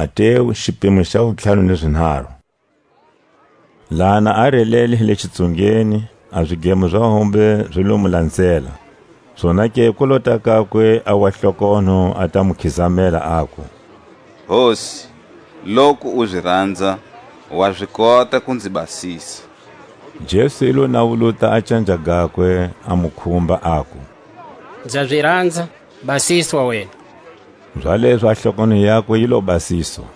Jesu a hanyisa a wa hlokonho. Laha na a relele hi le xitsungeni a zidlemo za hombe zi lo mu lanzela. Zonake ku lota kakwe a wa hlokonho a ta mu khizamela, aku: Hosi, loku u zi ranza, wa zi kota ku nzi basisa. Jesu i lo nawuluta a canja gakwe, a mu khumba, aku: Nza zi ranza, basiswa wena! Zalezo a hlokonho yakwe yi lo basiswa.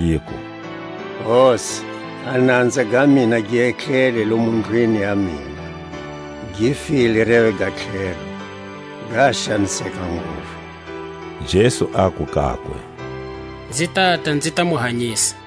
yiku: Hosi, a nanza ga mina gi etlele lomu ndlwini ya mina, gi file reve ga tlhelo, ga xaniseka nguvu. Jesu aku kakwe: Nzi tata nzi ta mu hanyisa.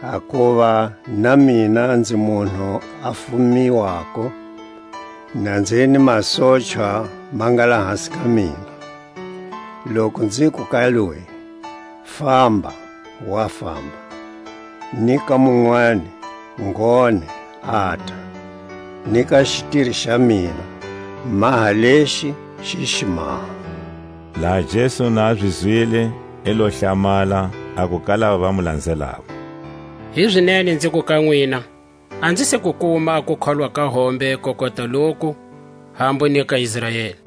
Hakuva na mina nzi munhu a fumi wako; na nzi hi ni masochwa ma nga lahasi ka mina. Loku nziku ka loyi: Famba, wa famba; ni ka munwani: Ngone, ata; ni ka xitiri xa mina: Maha lexi, xi xi maha. Laha Jesu na a zi zwile, i lo hlamala, aku ka lava va mu lanzelako: Hizinene nziku ka nwina, a nzi se ku kuma a kukholwa ka hombe ko kota loku, hambu ni ka Israeli.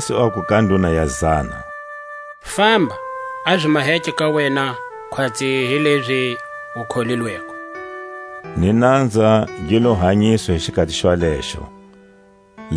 Jesu aku ka nduna ya zana: Famba, a zi maheke ka wena khwatsi hilezi u kholilweko. Ni nanza gi lo hanyiswa hi xikhati xwalexo. Kuhanyiswa ka mukokati wa Pedro.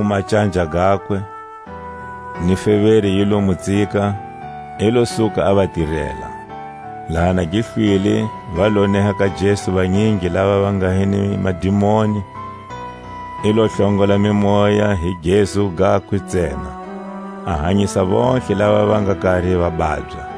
I lo khumba canja gakwe, ni feveri yi lo mu tsika; i lo suka, a va tirela. Laha na gi hlwile, va lo neha ka Jesu vanyingi lava va nga hi ni madimoni; i lo hlongola mimoya hi gezu gakwe ntsena, a hanyisa vontlhe lava va nga kari va babya;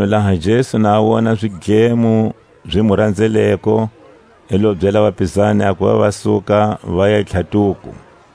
Makunu laha Jesu na a wona zidlemo zi mu ranzeleko, i lo byela vapizani a kuva va suka vaya tlhatuko.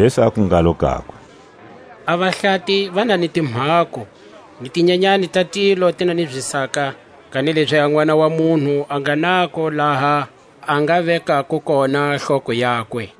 Jesu aku ngalo kakwe: A vahlati va na ni timhako, ni tinyanyani ta tilo ti na ni zisaka; kanilezi a Nʼwana wa munhu a nga nako laha a nga vekako kona hloko yakwe.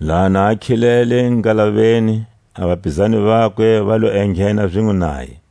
Laha na khilele ngalaveni, a vapizani vakwe va lo enghena zinwe naye.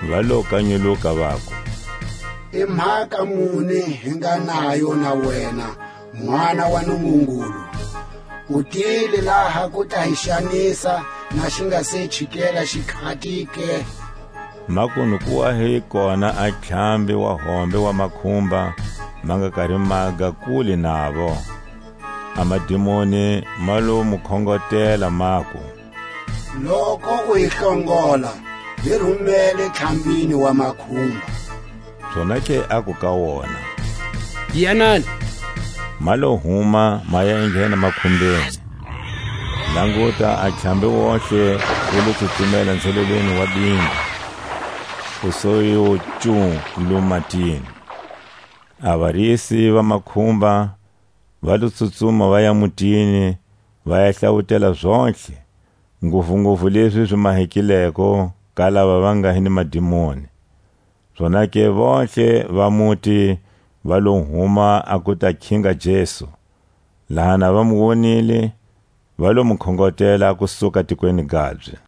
Va lo kanyuluka, vaku: I mhaka muni hi nga nayo na wena, Nʼwana wa Nungungulu? U tile laha ku ta hi xanisa na xi nga se ku chikela xikhati ke? Makunu ku wa hi kona a ntlhambi wa hombe wa makhumba ma nga kari maga kule navo. A madimoni ma lo mu khongotela, maku: Loku u hi hlongola, hi rumele ntlhambini wa makhumba. Zonake aku ka wona: Yanani! Ma lo huma, ma ya enghena makhumbeni. Languta, a ntlhambi wontihe wu lo tsutsumela nzhelelweni wa bimbi, wu su yo ncu lomo matini. A varisi va makhumba va lo tsutsuma vaya mutini, va ya hlawutela zontlhe, nguvunguvu lezi zi mahekileko ka lava va nga hi ni madimoni. Zonake vontlhe va muti va lo huma a ku ta khinga Jesu; laha na va mu wonile, va lo mu khongotela a ku suka tikweni gabye.